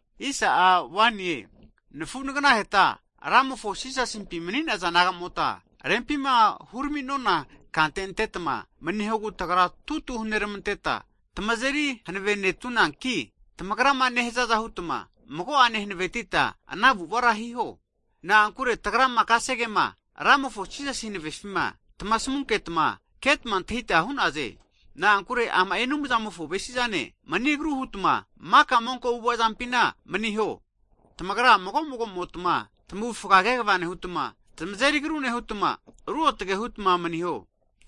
Hagi nafu naganaheta Ramofo Jisasimpi mani'naza nagamota, rempima huraminona kante antetma manihogu tagra tutu huneramanteta, tamazeri hanavenetunanki, tamagrama nehazaza hutma, mago'ane hanavetita ana avu'avara hiho. Na'ankure kasegema Ramofo Jisasi hanavefima tagrama tamasamunketma ketma antahita hu'naze. Na'ankure ama'i Anumzamofo avesizane, mani agru hutma maka monko avu'ava'zampi maniho. Tamagra mago magomotma tamavufga kegava nehutma, tamazeri agru nehutma, ruotge hutma maniho.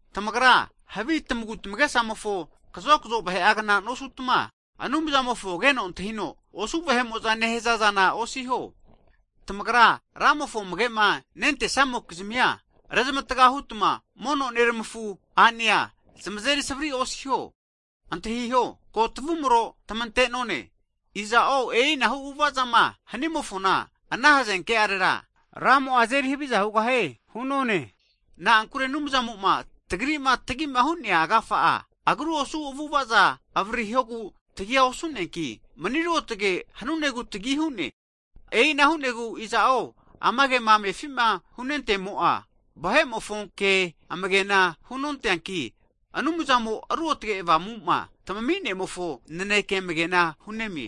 Tamagra havi monko tamagu tamagesamofona kazokzo vahe'agnara nosutma, Anumzamofo keno antahino osu vahe'mo'za nehaza zana osiho. Tamagra Ramofo amage'ma nentesamokizmia, rezmatga hutma mono Neramafu a'nea zamazeri savri osiho. Antahiho, ko tamavumro tamantenone. Iza'o e'inahu avu'avazama hanimofona, ana hazenke'arera, Ramo'a azeri haviza hugahie hu'none. Na'ankure Anumzamo'ma tagrima tagima hu'nea agafa'a, agru osu avu'avaza avaririhogu tagi osu'neanki, mani ruotge hanunegu tagi hu'ne. E'ina hunegu iza'o ama kema amefima hunentemo'a, vahe'mofo ke amagena hunonteanki, Anumzamo Ruotge Avamuma tamaminemofo naneke amagena hunemie.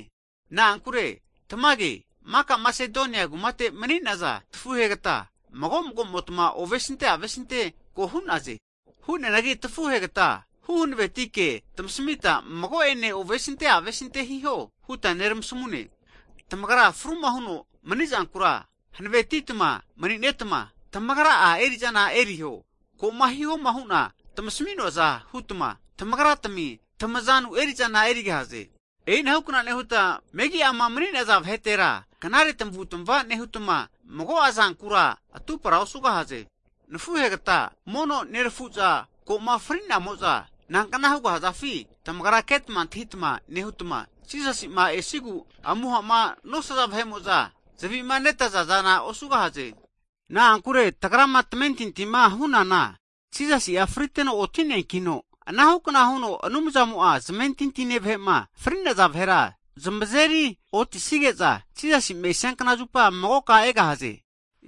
Na'ankure tamage, maka Masedonia kumate mani'naza tafuhe'ina makamotma ovesinte avesinte ko hu'naze. Hianagi tafuhegata huhanavetike tamasamita, mago'ene ovesinte avesinte hiho huta neramasamune. Tamagra fruma huno manizankura hanavetitma mani'netma, tamagra'a eri/zana eriho. Ko'ma hihoma huta tamasami'nonaza hutma, tamagratami tamazanu eri'zana erigahaze. E'inahukna nehutma, megi'ama mani'naza vahetera, knare tamavutmava nehutma, mago'a zankura atupara osugahaze. Hagi nafuhegta, mono nerafuza koma fri'namo'za nankna hugahazafi, tamagra ketma antahitama nehutma, Jisasi'ma esigu amuhama nosaza vahe'mo'za zavimanetaza zana osugahaze. Na'ankure tagrama tamentintima hunana Jisasi'a friteno oti'neankino, anahukna huno Anumzamo'a zmentintine vahe'ma fri'naza vahera zamazeri otisige'za, Jisasi'ma esiankna zupa magoka egahaze.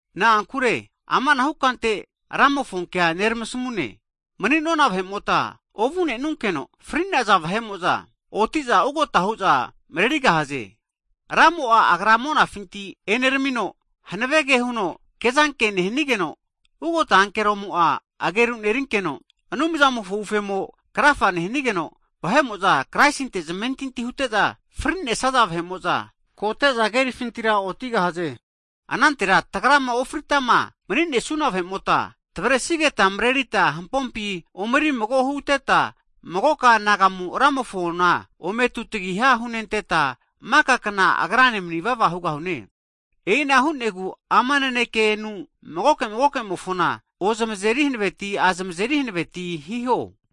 Na'ankure amanahu kante Ramofonkea neramasamune, mani'nona vahe'mota ovu'nenunkeno, fri'naza vahe'mo'za otiza ugota hu'za marerigahaze. Ramo'a Agra'a monafinti eneramino, hanavege huno kezanke nehanigeno, ugota ankeromo'a ageru nerinkeno, Anumzamofo ufemo krafa nehanigeno, vahe'mo'za Kraisinte zamentinti hute'za frinesaza vahe'mo'za kote'za kerifintira otigahaze. Anantera tagrama ofritama maninesuna vahe'mota, tavresigeta mrerita hampompi omeri mago huteta, magoka anagamu Ramofona ome tutagiha hunenteta, maka kna Agrane manivava hugahune. E'ina hu'negu ama nanekenu, magoke magokemofona ozamazeri hanaveti azamezeri hanaveti hiho.